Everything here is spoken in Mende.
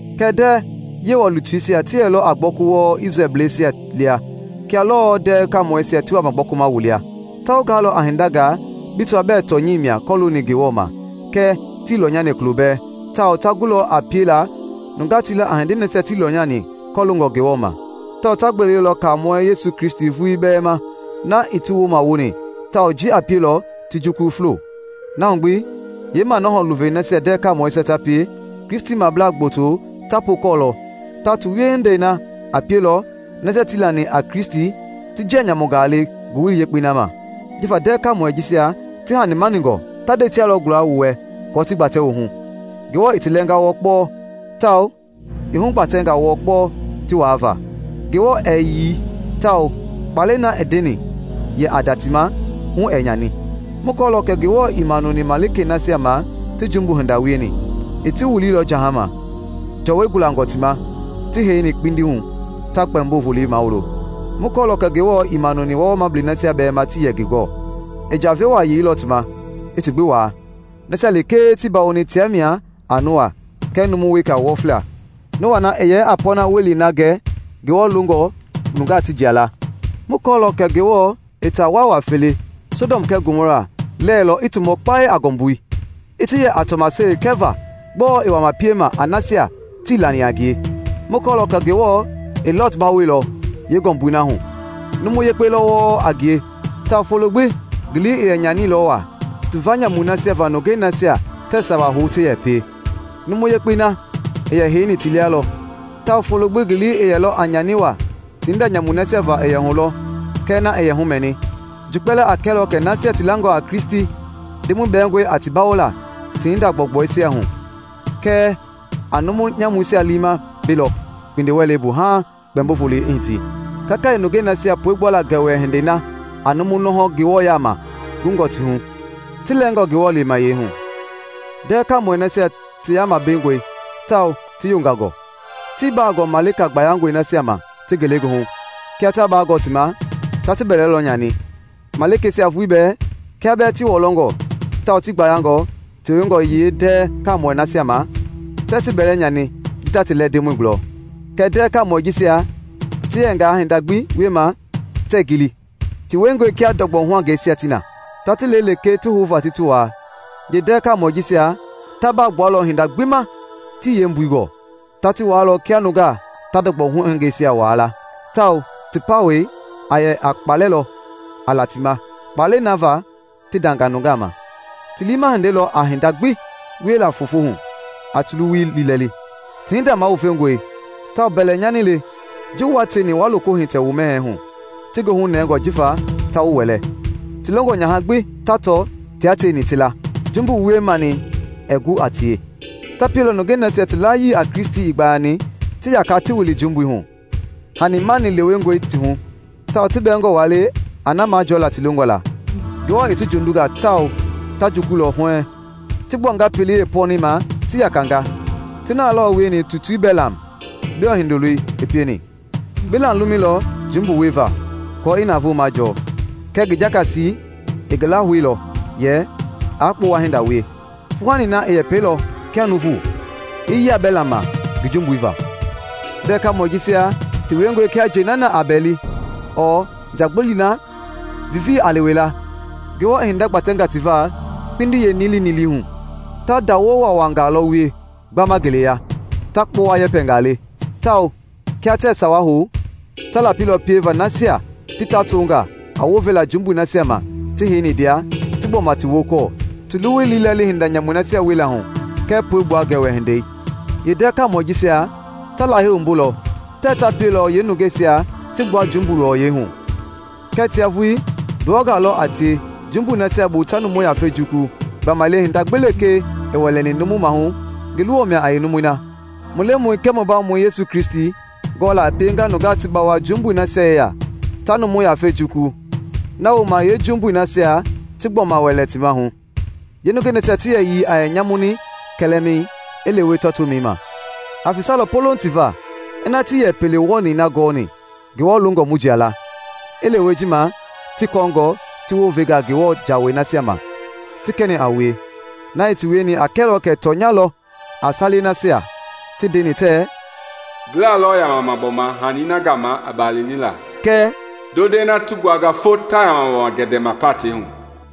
Kɛɛ ndɛɛ Yewɔ lutuisia ti yɛlɔ a gbɔku wɔɔ Isrɛlbleisia lia kia lɔɔ ndɛɛ kaamɔisia ti wama gbɔkuma wu lia. Ta wu gaalɔ a hindangaa bi tɔaa bɛɛ tɔnyɛi mia kɔlooni Ngewɔ ma kɛɛ tii lɔnyani kulo bɛɛ tawao ta gulɔ a piela nungaa ti la a hindei nasia tii lɔnyani kɔloongɔ Ngewɔ ma; tawao ta gbelelɔ Kaamɔɛi Yesu Kristi vulii bɛɛ ma na i ti wumawoni tawao ji a pielɔ ti jukulu fulo. Na hu gbi, yeemanɔhɔ luvei nasia ndɛɛ kaamɔisia ta pie Kristimabla gboto ta pookɔɔlɔ tawao ti wiehindei na a pielɔ nasia tii lani a Kristi ti njia nyamungaa le Ngowili Yekpei na ma. Jifa ndɛɛ kaamɔi jisia ti hanimaningɔ, ta ndɛisia lɔ guala wu wɛ kɔɔ ti gbatɛ wu hu. Ngewɔ i ti lɛɛnga wɔɔ kpɔɔ tawao i hugbatɛnga wɔɔ kpɔɔ ti waava. Ngewɔ ɛɛ yii tawao kpaalɛi na i ndeni yɛ a nda ti ma, hu ɛɛ nyani. Mu kɔɔlɔ kɛ Ngewɔ ii manuni malikei nasia ma ti jumbu hinda wieni; i ti wiliilɔ jahama, jɔwɔi gulangɔ ti ma ti heini kpindi hu ta Kpɛmbo Volei mawulo. Mu kɔɔlɔ kɛ Ngewɔ ii manuni wɔɔwɔɔmablɛi nasia bɛɛ ma tii yɛ ngi gɔɔ, i njave waa yeilɔ ti ma i ti gbi waa; nasia lekee i ti bawoni tia mia a Noa kɛɛ numu weka wɔfila, Noa na i yɛ a pɔɔna welei na gɛ Ngewɔ longɔ nungaa ti jia la. Mu kɔɔlɔ kɛ Ngewɔ i taa waawa fele, Sɔdɔm kɛɛ Gomɔra, lɛɛlɔ i ti mɔ kpae a ngɔmbui, i ti yɛ a tɔmaseli kɛva gbɔɔ i wama peima a nasia tii lani a ngie. Mu kɔɔlɔ kɛ Ngewɔ i Lɔt bawoilɔ yeengɔmbui na hu; numu yekpe lɔ wɔɔ a ngie tawao folo gbi ngi lii i yɛ nyanilɔ waa tuva nyamui nasia va nungei nasia tɛɛ sawa hou ti yɛ pie. Numu yekpei na i yɛ heini ti lia lɔ, tawao folo gbi ngi lii i yɛlɔ a nyani waa ti hinda nyamui nasia va i yɛ hulɔ kɛɛ na i yɛ humɛni. Ji kpɛlɛɛ a kɛlɔ kɛ nasia ti langɔ a Kristi, Ndemɔi bɛɛngɔe a ti bawola ti hinda gbɔugbɔisia hu; kɛɛ a numu nyamuisia liima belɔ kpindi-wɛlei bu haaŋ Kpɛmbo Volei i hiti, kakayee nungei nasia puegbuala gɛwɛ hindei na a numu nɔhɔ Ngewɔ yaama gungɔ ti hu, ti lɛɛngɔ Ngewɔ lemayɛi hu. Ndɛɛ kaamɔi nasia ti yaama bengɔi tawao ti yongangɔ, tii baa gɔɔ malika gbayangɔi nasia ma ti ngelegoohu; kia taa baa gɔɔ ti ma, ta ti bɛlɛ lɔ nyani. Malikeisia vulii bɛɛ, kia bɛɛ ti wɔlɔngɔ tawao ti gbayangɔ tewengɔ yeendɛɛ kaamɔi nasia ma, tɛɛ ti bɛlɛ nyani ji ta ti lɛɛ Ndemɔi gulɔ. Kɛɛ ndɛɛ kaamɔi jisia ti yɛngaa hinda gbi wiema tɛɛ gili, ti wiengɔe kia ndɔgbɔ huangɛisia ti na, ta ti le lekee ti houva ti ti waa; yeendɛɛ kaamɔɛi jisia ta baa gbualɔ hinda gbi ma tii yeembui gɔɔ. Ta ti waalɔ kia nungaa ta ndɔgbɔ huangɛisia waa la, tawao ti pawɛi a yɛ a kpaalɛ lɔ a la ti ma kpaalɛi na va ti ndanga nungaa ma. Ti liima hindei lɔ a hinda gbi weila foofo hu a ti luwui liilɛli; ti hinda mawufengɔe tawao mbɛlɛnyani le ji wua tieni wa loko hitɛ wu mɛhɛɛi hu, ti goohu nɛngɔ jifa ta wu wɛlɛ. Ti longɔ nyaha gbi ta tɔ tia tieni ti la; jumbu wie-manii ɛɛ gu a tie. Ta pielɔ nungei nasia ti layii a Kristi ii gbayani ti yaka ti wili jumbui hu. Hanimani lewengɔe ti hu tawao ti bɛɛngɔ waa le a na majɔɔla ti longɔ la. Ngewɔ i ti jondunga tawao ta jukululɔ huɛɛŋ. Ti gbuanga pelei yeepɔnɛi ma ti yakanga; ti na lɔ wieni tutui Belam, Biɔ hindoloi, i pieni. Belam lumɛilɔ jumbu wuliva aako i navoo majɔɔ. Kɛɛ ngi jakasi i ngi lahouilɔ yɛ aa kpowa hinda wie. Fuuhani na i yɛpɛilɔ kia nuuvu, i yia Belam ma ngi jumbui va. Ndɛɛ kaamɔi jisia ti wiengɔe kia njɛi na a bɛɛli, ɔɔ njagbili na viivii a lewe la; Ngewɔ i hinda gbatɛnga ti va kpindi yeenilinilii hu. Ta ndawo waawaangaa lɔ wie gbama ngeleya, ta kpowa yɛpɛngaa le, tawao kia tɛɛ sawa hou, ta lapilɔ pieva nasia ti tɔɔtonga a wounvela jumbui nasia ma ti heini ndia, ti gbɔma ti wokɔɔ ti luwui liilɛli hinda nyamuisia wiela hu kɛɛ puegbua gɛwɛ hindei. Yeendɛɛ kaamɔi jisia ta Lahei wumbulɔ tɛɛ ta pielɔ yeenungeisia ti gbua jumbui luwɔyɛi hu kɛɛ tia vulii nduwɔngaa lɔ a tie jumbui nasia bu ta numu yafei jukulu gbamaile hinda gbi lekee i wɛlɛni numu maahu, ngi luwɔ mia a yeenumui na. Mu Lemɔi kɛɛ mu Bawomɔi Yesu Kristi gɔɔla i piengaa nungaa ti bawo jumbui nasia yeya ta numu yafei jukulu, na wooma yeejumbui nasia ti gbɔma wɛlɛ ti maahu, yeenungɛi nasia ti yɛyii a yɛ nyamuni kɛlɛmɛi i lewe tɔɔtomɛi ma. Aa fesalɔ polouŋ ti va ina tii yɛ pelei wɔɔni na gɔɔni Ngewɔ longɔ mu jia la, i lewe ji ma ti kɔɔngɔ ti wounvenga Ngewɔ jawei nasia ma ti kɛni a wue. Na i ti wieni a kɛlɔ kɛ tɔnya lɔ a salei nasia ti ndeni tɛɛ, “Ngilɛi lɔ yamama gbɔma hani na gama i balini la” kɛɛ “Ndondɛi na ti nguanga fo, taa yamama gendebelema patɛi hu.”